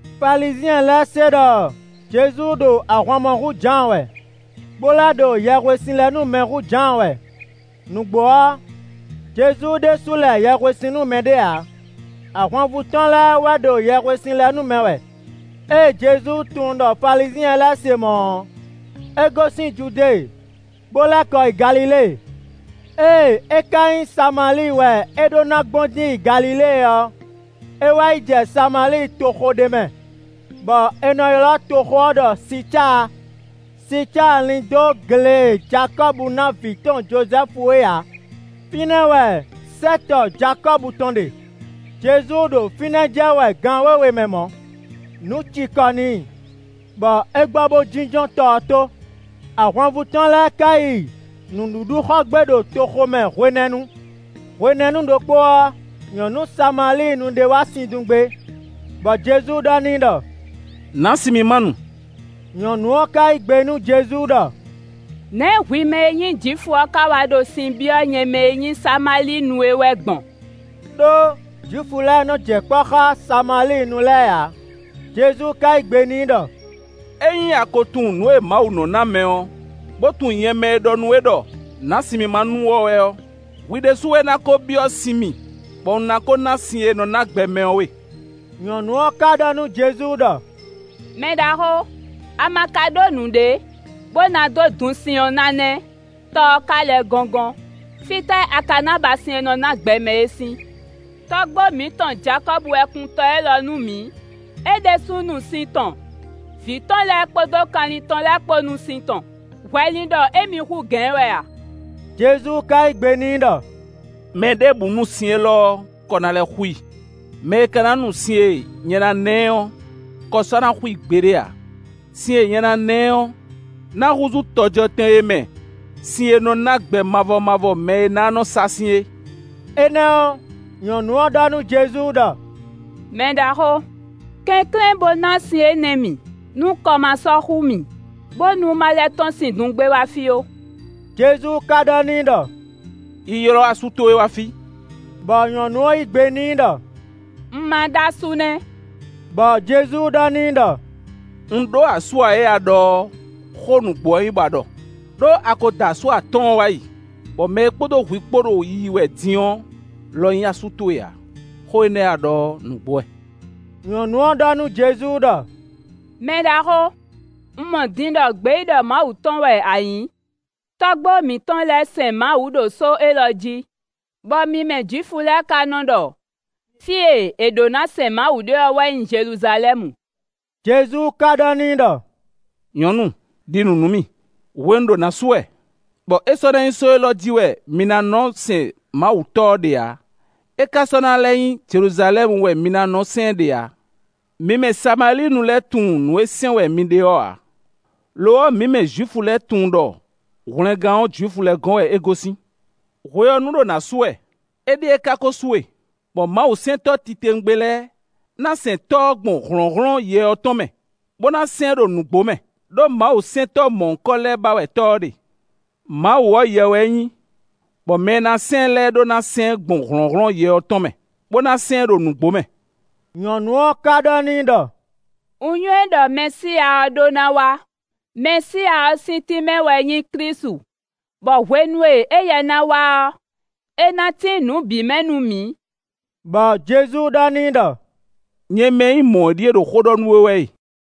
Falizyɛn lɛ́ɛ se ɖɔ Jezu ɖo ahwan mɔ hú Jǎan wɛ, bó lɛ́ ɖo yɛhwesin lɛ nú mɛ hú Jǎan wɛ. Nǔgbó ɔ́, Jezu ɖésú lɛ yɛhwesin nú mɛɖé ǎ, ahwanvú tɔn lɛ́ɛ wɛ ɖo yɛhwesin lɛ nú mɛ wɛ. Ée Jezu tunwun ɖɔ Falizyɛn lɛ́ɛ se mɔ̌ ɔ́, é gosín Judée bo lɛ́ kɔ yi Galilée. Ée é ka nyí Samalíi wɛ é ɖó ná gbɔn dín yi Galilée ɔ́, é wá yi jɛ Samalíi toxo ɖé mɛ, bɔ è nɔ ylɔ́ toxo ɔ́ ɖɔ Sicáa; Sicáa lín dó gle e Jakɔ́bu ná vǐ tɔn Jozɛ́fu é ǎ. Fínɛ́ wɛ sɛ́tɔ Jakɔ́bu tɔn ɖe. Jezu ɖo fínɛ́ jɛ wɛ gan wěwe mɛ mɔ̌. Nǔ cikɔ n'i, bɔ é gbɔ bo jínjɔ́n tɔ ɔ́ tó. Ahwanvú tɔn lɛ́ɛ ka yi nǔɖuɖu xɔ gbé ɖo toxo mɛ hwenɛ́nu. Hwenɛ́nu ɖokpó ɔ́, nyɔ̌nu Samalíinu ɖé wá sin dun gbé, bɔ Jezu ɖɔ n'i ɖɔ: “Nǎ sin mì má nu.” Nyɔ̌nu ɔ́ ka yí gbe nú Jezu ɖɔ: “Nɛ̌ hwi mɛ e nyí Jwifu ɔ́ ka wá ɖo sin byɔ́ nyɛ mɛ e nyí Samalíinu é wɛ gbɔn?” (Đó Jwifu lɛ́ɛ nɔ jɛ kpɔ́ xá Samalíinu lɛ́ɛ ǎ.) Jezu ka yí gbe n'i ɖɔ: “Ényí a ko tunwun nǔ e Mawu nɔ ná mɛ ɔ́, bó tunwun nyɛ mɛ e ɖɔ nú we ɖɔ: nǎ sin mì ma nu ɔ́ wɛ ɔ́, hwi ɖésú wɛ ná ko byɔ́ sin mì bɔ un ná ko ná sin e nɔ ná gbɛ mɛ ɔ́ we.” Nyɔ̌nu ɔ́ ka ɖɔ nú Jezu ɖɔ: “Mɛɖaxó! A ma ka ɖó nǔɖé, bó ná dó dun sin ɔ́ ná nɛ́, tɔ ɔ́ ka lɛ́ gɔ́ngɔ́n. Fítɛ́ a ka ná ba sin e nɔ ná gbɛ mɛ é sín? Tɔ́gbó mǐtɔn Jakɔ́bu wɛ kun tɔ élɔ́ nú mǐ. É ɖésúnɔ nu sin tɔn; vǐ tɔn lɛ́ɛ kpódó kanlin tɔn lɛ́ɛ kpó nu sin tɔn. Hwɛ lin ɖɔ émí hú gǎn ɛ wɛ a?” Jezu ka yí gbe n'i ɖɔ: “Mɛɖěbǔ nu sin élɔ́ ɔ́, kɔ ná lɛ́ xú i. Mɛ e ka ná nu sin e nyɛ ná ná ɛ ɔ́, kɔ sɔ́ ná xú i gbeɖé ǎ. Sin e nyɛ ná ná ɛ ɔ́, ná húzú tɔjɔtɛn e mɛ sin e nɔ ná gbɛ mavɔ mavɔ mɛ é ná nɔ sa sín é.” Énɛ́ ɔ́, nyɔ̌nu ɔ́ ɖɔ nú Jezu ɖɔ: “Mɛɖaxó, kɛnklɛ́n bó ná sin énɛ́ mì, nú kɔ ma sɔ́ xú mì, bónú ma lɛ́ tɔ́n sin dun gbé wá fí ó.” Jezu ka ɖɔ n'i ɖɔ: “Yi ylɔ́ asú towe wá fí.” Bɔ nyɔ̌nu ɔ́ yí gbe n'i ɖɔ: “Un ma ɖó asú nɛ́;” bɔ Jezu ɖɔ n'i ɖɔ: “Un ɖó asú ǎ e a ɖɔ ɔ́, xó nǔgbó wɛ nyí bɔ a ɖɔ. Đó a ko da asú atɔ́ɔ́n wá yi, bɔ mɛ e kpódó hwi kpó ɖo yiyi wɛ din ɔ́ lɔ nyí asú towe ǎ. Xó énɛ́ e a ɖɔ ɔ́, nǔgbó wɛ.” Nyɔ̌nu ɔ́ ɖɔ nú Jezu ɖɔ: “Mɛɖaxó, un mɔ din ɖɔ gbeyíɖɔ Mawu tɔn wɛ a nyǐ. Tɔ́gbó mǐtɔn lɛ́ɛ sɛn Mawu ɖo só élɔ́ jí, bɔ mi mɛ Jwifu lɛ́ɛ ka nɔ ɖɔ fí e è ɖǒ na sɛn Mawu ɖe ɔ́ wɛ nyí Jeluzalɛ́mu.” Jezu ka ɖɔ n'i ɖɔ: “Nyɔ̌nu; ɖi nǔ nú mì; hwenu ɖo nǎ su wɛ, bɔ é sɔ́ ná nyí só élɔ́ jí wɛ mi ná nɔ sɛn Mawu Tɔ́ ɔ́ ɖe ǎ, é ka sɔ́ ná lɛ́ nyí Jeluzalɛ́mu wɛ mi ná nɔ sɛn ɛ ɖe ǎ. Mi mɛ Samalíinu lɛ́ɛ tunwun nǔ e sɛn wɛ mi ɖe ɔ́ ǎ; lo ɔ́, mǐ mɛ Jwifu lɛ́ɛ tunwun ɖɔ hwlɛngán ɔ́ Jwifu lɛ́ɛ gɔ́n wɛ é gosín. Hwe ɔ́ nu ɖo nǎ su wɛ, éɖíe ka ko su e, bɔ Mawusɛntɔ́ titewungbe lɛ́ɛ ná sɛn Tɔ́ ɔ́ gbɔn hlɔ̌nhlɔ́n Yɛ ɔ́ tɔn mɛ, bó ná sɛn ɛ ɖo nǔgbó mɛ. Đó Mawusɛntɔ́ mɔ̌hunkɔ lɛ́ɛ ba wɛ Tɔ́ ɔ́ ɖe. Mawu ɔ́, Yɛ wɛ é nyí; bɔ mɛ e ná sɛn ɛ lɛ́ɛ ɖó ná sɛn ɛ gbɔn hlɔ̌nhlɔ́n Yɛ ɔ́ tɔn mɛ, bó ná sɛn ɛ ɖo nǔgbó mɛ.” Nyɔ̌nu ɔ́ ka ɖɔ n'i ɖɔ: “Un nywɛ́ ɖɔ Mɛsíya ɔ́ ɖó ná wá: (Mɛsíya ɔ́ sín tínmɛ wɛ nyí Klísu.) Bɔ hwenu e éyɛ́ ná wá ɔ́, é ná tín nǔ bǐ mɛ nú mǐ.” Bɔ Jezu ɖɔ n'i ɖɔ: “Nyɛ mɛ e nyí mɔ̌ ɔ́ ɖíe ɖo xó ɖɔ nú we wɛ e.”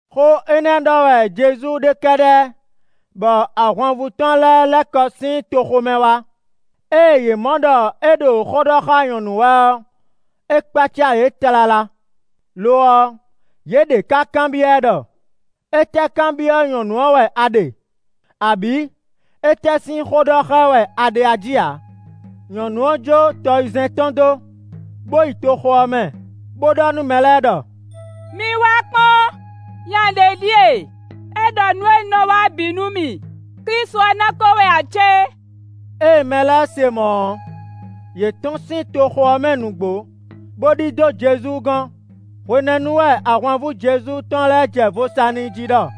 Xó énɛ́ ɖɔ wɛ Jezu ɖe kɛ́ɖɛ́ bɔ ahwanvú tɔn lɛ́ɛ lɛ́ kɔ sín toxo mɛ wá. Ée yě mɔ ɖɔ é ɖo xó ɖɔ xá nyɔ̌nu wɛ ɔ́, é kpácá yě tlala; lo ɔ́, yě ɖě ká kanbyɔ́ ɛ ɖɔ: “Étɛ́ kanbyɔ́ nyɔ̌nu ɔ́ wɛ a ɖe.” Abǐ “Étɛ́ sín xó ɖɔ xá ɛ wɛ a ɖe a jí ǎ.” Nyɔ̌nu ɔ́ jó tɔyizɛ́n tɔn dó, bo yi toxo ɔ́ mɛ, bó ɖɔ nú mɛ lɛ́ɛ ɖɔ: “Mi vɛ́ wá kpɔ́n! Nya ɖě ɖíe! É ɖɔ nǔ e un wa ɔ́ bǐ nú mì. Klísu ɔ́ ná ko wɛ ǎ cé?” Ée mɛ lɛ́ɛ se mɔ̌ ɔ́, yě tɔ́n sín toxo ɔ́ mɛ nǔgbó bó ɖidó Jezu gɔ́n. Hwenɛ́nu wɛ ahwanvú Jezu tɔn lɛ́ɛ jɛ vo sa n'i jí ɖɔ: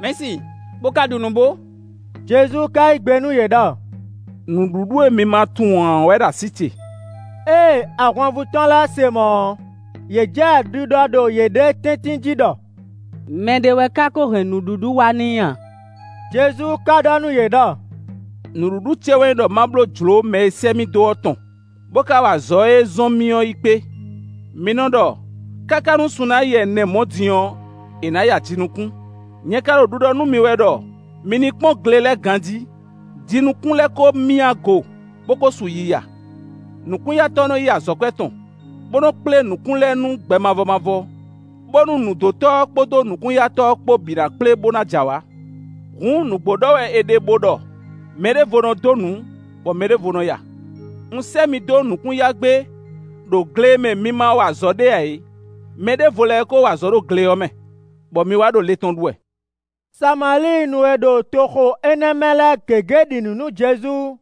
“Mɛ̌si, bo ka ɖu nǔ bó!” Jezu ka yí gbe nú yě ɖɔ: “Nǔɖuɖu e mi ma tunwun ǎ ɔ́ wɛ ɖo así ce.” Ée ahwanvú tɔn lɛ́ɛ se mɔ̌ ɔ́, yě jɛ ɖiɖɔ ɖo yěɖée tɛ́ntin jí ɖɔ: “Mɛ ɖé wɛ ka ko hɛn nǔɖuɖu wá n'i a?” Jezu ka ɖɔ nú yě ɖɔ: “Nǔɖuɖu ce wɛ nyí ɖɔ ma bló jlǒ mɛ e sɛ́ mì dó ɔ́ tɔn, bó ka wa azɔ̌ e é zɔ́n mì ɔ́ yi kpé. Mi nɔ ɖɔ: ‘káká nú sun ná yi ɛnɛ mɔ̌ din ɔ́, è nǎ ya jinukún.’ Nyɛ ka ɖo ɖiɖɔ nú mi wɛ ɖɔ mi ní kpɔ́n gle lɛ́ɛ ganjí; jinukún lɛ́ɛ ko myá go, bó kó su yiya. Nukún-yatɔ́ nɔ yí azɔ̌kwɛ́ tɔn, bó nɔ́ kplé nǔkún lɛ́ɛ nú gbɛ mavɔ mavɔ, bónú nǔdótɔ́ ɔ́ kpódó nukún-yatɔ́ ɔ́ kpó bǐ ná kplé, bó ná j'awǎ. Hǔn nǔgbó ɖɔ wɛ è ɖe, bo ɖɔ: ‘Mɛ ɖěvo nɔ dó nǔ, bɔ mɛ ɖěvo nɔ ya’. Un sɛ́ mi dó nukún ya gbé ɖo gle e mɛ mi ma wa azɔ̌ ɖe ǎ é. Mɛ ɖěvo lɛ́ɛ wɛ ko wa azɔ̌ ɖo gle ɔ́ mɛ, bɔ mi wá ɖo le tɔn ɖu wɛ.” Samalíinu e ɖo toxo énɛ́ mɛ lɛ́ɛ gěgé ɖi nǔ nú Jezu;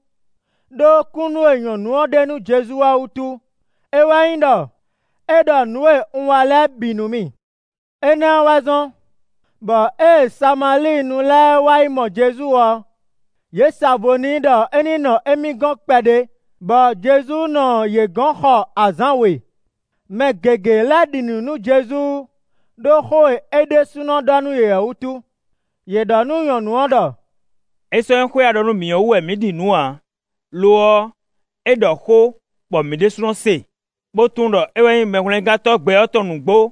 ɖó kúnnu e nyɔ̌nu ɔ́ ɖe nú Jezu ɔ́ wútu. É wɛ nyí ɖɔ: “É ɖɔ nǔ e un wa lɛ́ɛ bǐ nú mì.” Énɛ́ ɔ́ wɛ zɔ́n, bɔ ée Samalíinu lɛ́ɛ wá yi mɔ Jezu ɔ́, yě sa vo n'i ɖɔ é ní nɔ émí gɔ́n kpɛɖé bɔ Jezu nɔ yě gɔ̌n xɔ azǎn we; mɛ gěgé lɛ́ ɖi nǔ nú Jezu ɖó xó e é ɖésúnɔ ɖɔ nú yě ɔ́ wútu. Yě ɖɔ nú nyɔ̌nu ɔ́ ɖɔ: “É sɔ́ nyí xó e a ɖɔ nú mǐ ɔ́ wú wɛ mǐ ɖi nǔ ǎ, lo ɔ́, é ɖɔ xó bɔ mǐ ɖésúnɔ se, bó tunwun ɖɔ é wɛ nyí Mɛhwlɛ́ngántɔ́ gbɛ ɔ́ tɔn nǔgbó.”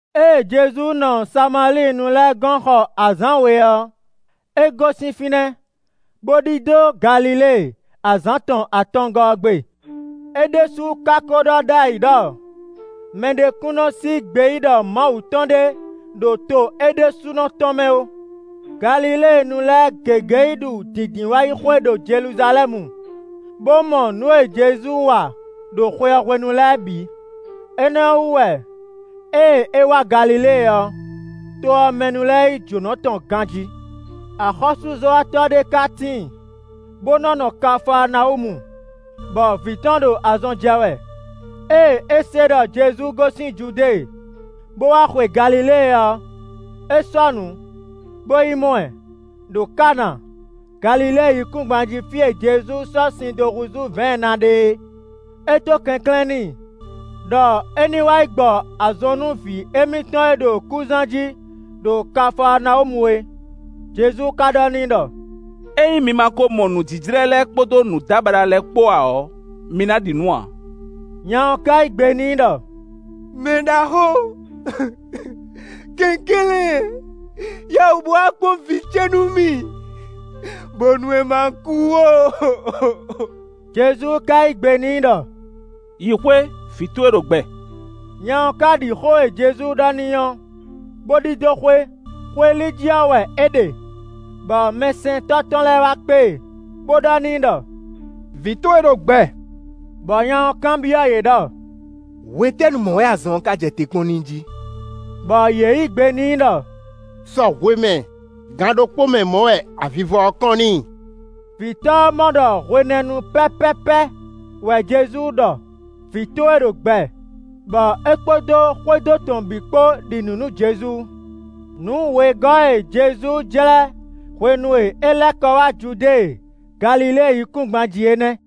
Ée Jezu nɔ Samalíinu lɛ́ɛ gɔ́n xɔ azǎn we ɔ́, é gosín fínɛ́, bó ɖidó Galilée azǎn tɔn atɔngɔ́ ɔ́ gbe. É ɖésú ka ko ɖɔ ɖ'ayǐ ɖɔ mɛɖé kún nɔ sí gbeyíɖɔ Mawu tɔn ɖé ɖo to é ɖésúnɔ tɔn mɛ ó. Galiléenu lɛ́ɛ gěgé yi ɖu Dǐndínwáyixwe ɖo Jeluzalɛ́mu, bó mɔ nǔ e Jezu wa ɖo xwe ɔ́ hwenu lɛ́ɛ bǐ; énɛ́ ɔ́ wú wɛ ée é wá Galilée ɔ́, to ɔ́ mɛ nu lɛ́ɛ yí jǒnɔ tɔn ganjí. Axɔ́súzɔ́watɔ́ ɖé ká tíin, bó nɔ́ nɔ Kafaanawúmu, bɔ vǐ tɔn ɖo azɔn jɛ wɛ. Ée é se ɖɔ Jezu gosín Judée, bo wá xwe Galilée ɔ́, é sɔ́nǔ, bo yi mɔ ɛ, ɖo Kana, Galilée yíkúngban jí fí e Jezu sɔ́ sin dó húzú vɛ̌ɛn ná ɖe é. É dó kɛnklɛ́n n'i, ɖɔ é ní wá yi gbɔ azɔn nú vǐ émítɔn e ɖo kúzán jí ɖo Kafaanawúmu é. Jezu ka ɖɔ n'i ɖɔ: “Ényí mi ma ko mɔ nǔjíjlɛ́ lɛ́ɛ kpódó nǔdábaɖa lɛ́ɛ kpó ǎ ɔ́, mi ná ɖi nǔ ǎ.” Nya ɔ́ ká yí gbe n'i ɖɔ: “Mɛɖaxó, kɛnklɛ́n, yá wǔ bó wá kpɔ́n vǐ ce nú mì, bónú é ma kú ó.” Jezu ka yí gbe n'i ɖɔ: “Yi xwé, vǐ towe ɖo gbɛ.” Nya ɔ́ ka ɖi xó e Jezu ɖɔ n'i ɔ́, bó ɖidó xwé. Xwé li jí ɔ́ wɛ é ɖe, bɔ mɛsɛntɔ́ tɔn lɛ́ɛ wá kpé e, bó ɖɔ n'i ɖɔ: “Vǐ towe ɖo gbɛ!” Bɔ nya ɔ́ kanbyɔ́ yě ɖɔ: “Hwetɛ́nu mɔ̌ wɛ azɔn ɔ́ ka jɛ te kpɔ́n n'i jí?” Bɔ yě yí gbe n'i ɖɔ: “Sɔ hwemɛ, gan ɖokpó mɛ mɔ̌ wɛ avivɔ ɔ́ kɔ́n n'i.” Vǐtɔ́ ɔ́ mɔ ɖɔ hwenɛ́nu pɛ́pɛ́pɛ́ wɛ Jezu ɖɔ: “Vǐ towe ɖo gbɛ.” Bɔ é kpódó xwédo tɔn bǐ kpó ɖi nǔ nú Jezu. Nǔ wegɔ́ e Jezu jlɛ́ hwenu e é lɛ́ kɔ wá Judée, Galilée yíkúngban jí é nɛ́.